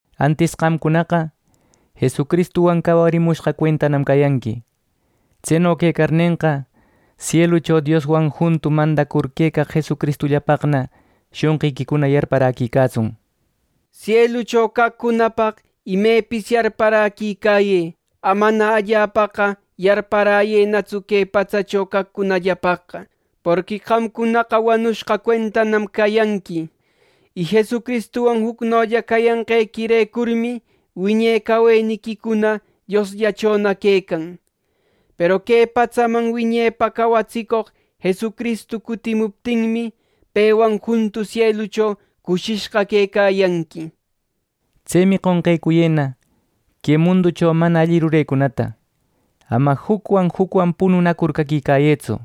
Antis qamcunaqa Jesucristuwan cawarimushqa cuentanam cayanqui. Tseno quecarnenqa, sielucho Dioswan juntu mandacur quecaq Jesucristullapaqna shonqiquicuna yarparäquicatsun. Sielucho caqcunapaq imepis yarparäquicayë. Amana allapaqa yarparäyënatsu que patsacho caqcunallapaqqa; porqui qamcunaqa wanushqa cuentanam cayanqui, y Jesucristuwan jucnolla cayanqequirecurmi wiñe caweniquicuna Diosllachona quecan. Peru que patsaman wiñepa cawatsicoq Jesucristu cutimuptinmi, pewan juntu sielucho cushishqa quecayanqui. Tsemi qonqecuyëna que munducho mana alli rurecunata. Ama jucwan jucwan pununacur caquicayëtsu,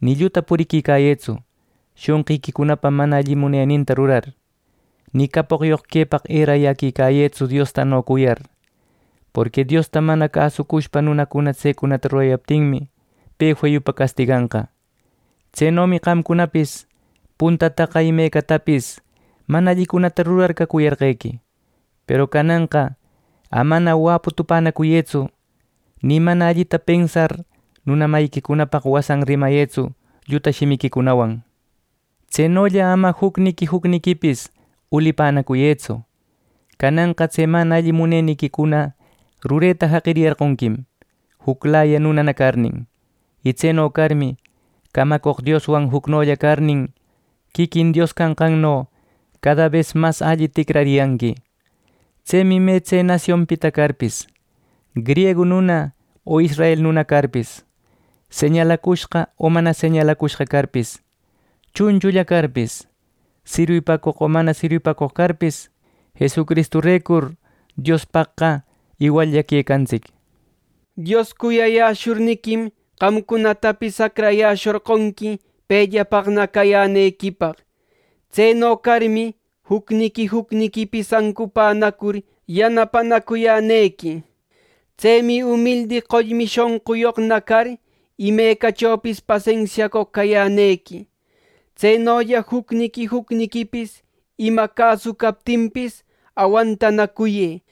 ni lluta puriquicayëtsu, shonqiquicunapa mana alli muneninta rurar. Ni capoqyoq quepaq erayäquicayëtsu Diostano cuyar. Porqui Diosta mana cäsushpa nunacuna tsecunata rurayaptinmi, pe feyupa castiganqa. Tsenomi qamcunapis puntataqa imecatapis mana allicunata rurar cacuyarqequi, peru cananqa amana wäpu tupänacuyëtsu, ni mana allita pensar, nuna mayiquicunapaq wasan rimayëtsu lluta shimiquicunawan. Tsenolla ama jucniqui jucniquipis ulipänacuyëtsu. Cananqa tse mana alli muneniquicuna rureta jaqiriyarqonquim, juclaya nunana carnin. Y tseno carmi camacoq Dioswan jucnolla carnin, quiquin Dios canqanno cada bes mas alli ticrariyanqui. Tsemi me tse nasionpita carpis, griegu nuna o israel nuna carpis, señalacushqa o mana señalacushqa carpis, chunchulla carpis, sirwipacoq o mana sirwipacoq carpis, Jesucristurecur Diospaqqa iwallla quecantsic. Dios cuyayäshurniquim, qamcunatapis acrayäshorqonqui pellapaqna cayänequipaq. Tseno carmi, jucniqui jucniquipis ancupänacur yanapanacuyänequi. Tsemi umildi qollmi shonquyoqna car, imachopis pasensiacoq cayänequi. Tsenolla jucniqui jucniquipis ima cäsu captinpis awantanacuyë.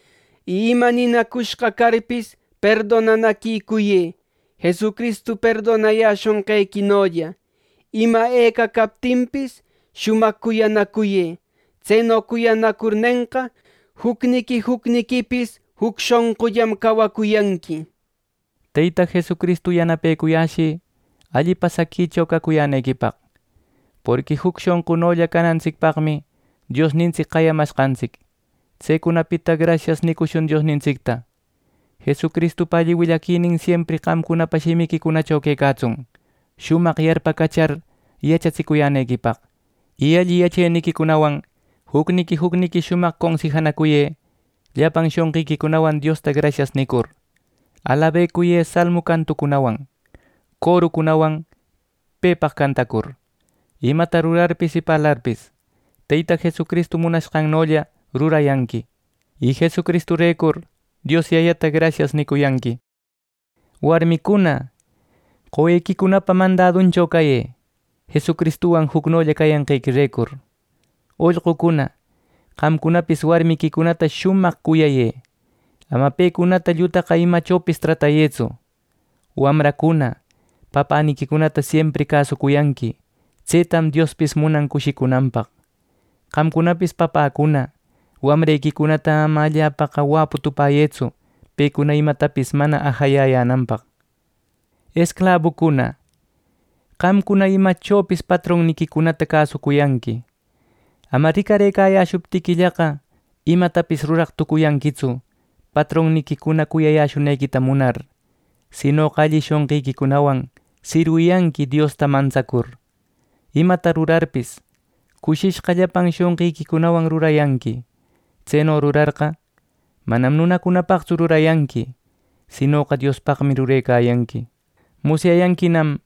Y ima ninacushqa carpis, perdonanaquicuyë, Jesucristu perdonayäshonqequinolla. Ima eca captinpis shumaq cuyanacuyë. Tseno cuyanacurnenqa, jucniqui jucniquipis juc shonqullam cawacuyanqui. Teyta Jesucristu yanapecuyäshï alli pasaquicho cacuyänequipaq; porqui juc shonqunolla canantsicpaqmi Diosnintsic qayamashqantsic. Tsecunapita “Grasias” nicushun Diosnintsicta. Jesucristupa alli willaquinin siempri qamcunapa shimiquicunacho quecatsun, shumaq yarpacachar yachatsinacuyänequipaq. Y alli yacheniquicunawan jucniqui jucniqui shumaq consijanacuyë. Llapan shonqiquicunawan Diosta “Grasias” nicur, alabecuyë Salmu cantucunawan, corucunawan pepaq cantacur. Imata rurarpis y parlarpis, Teyta Jesucristu munanqannolla rurayanqui, y Jesucristurecur Dios Yayata “Grasias” nicuyanqui. Warmicuna, qowequicunapa mandaduncho cayë, Jesucristuwan jucnolla cayanqequirecur. Ollqucuna, qamcunapis warmiquicunata shumaq cuyayë. Ama pecunata llutaqa imachopis tratayëtsu. Wamracuna, papäniquicunata siempri cäsuyanqui. Tsetam Diospis munan cushicunanpaq. Qamcunapis papäcuna, wamrequicunata ama allapaqa wäpu tupäyëtsu, pecuna imatapis mana ajayayänanpaq. Esclabucuna, qamcuna imecachopis patronniquicunata cäsuyanqui. Ama ricarëcayäshuptiquillaqa, imatapis ruraq tucuyanquitsu patronniquicuna cuyayäshunequita munar, sinoqa alli shonqiquicunawan sirwiyanqui Diosta mantsacur. Imata rurarpis, cushishqa llapan shonqiquicunawan rurayanqui. Tseno rurarqa, manam nunacunapaqtsu rurayanqui, sinoqa Diospaqmi rurecayanqui. Musyayanquinam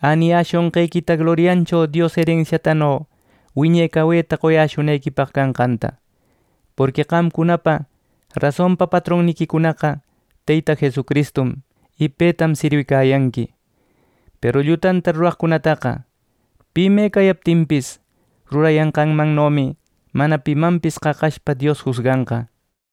äniyäshonqequita gloriancho Dios erensiatano wiñe caweta qoyäshunequipaq canqanta. Porqui qamcunapa rasonpa patronniquicunaqa Teyta Jesucristum, y petam sirwicayanqui. Peru llutanta ruraqcunataqa, pi me cayaptinpis, rurayanqanmannomi mana pimanpis qaqashpa Dios jusganqa.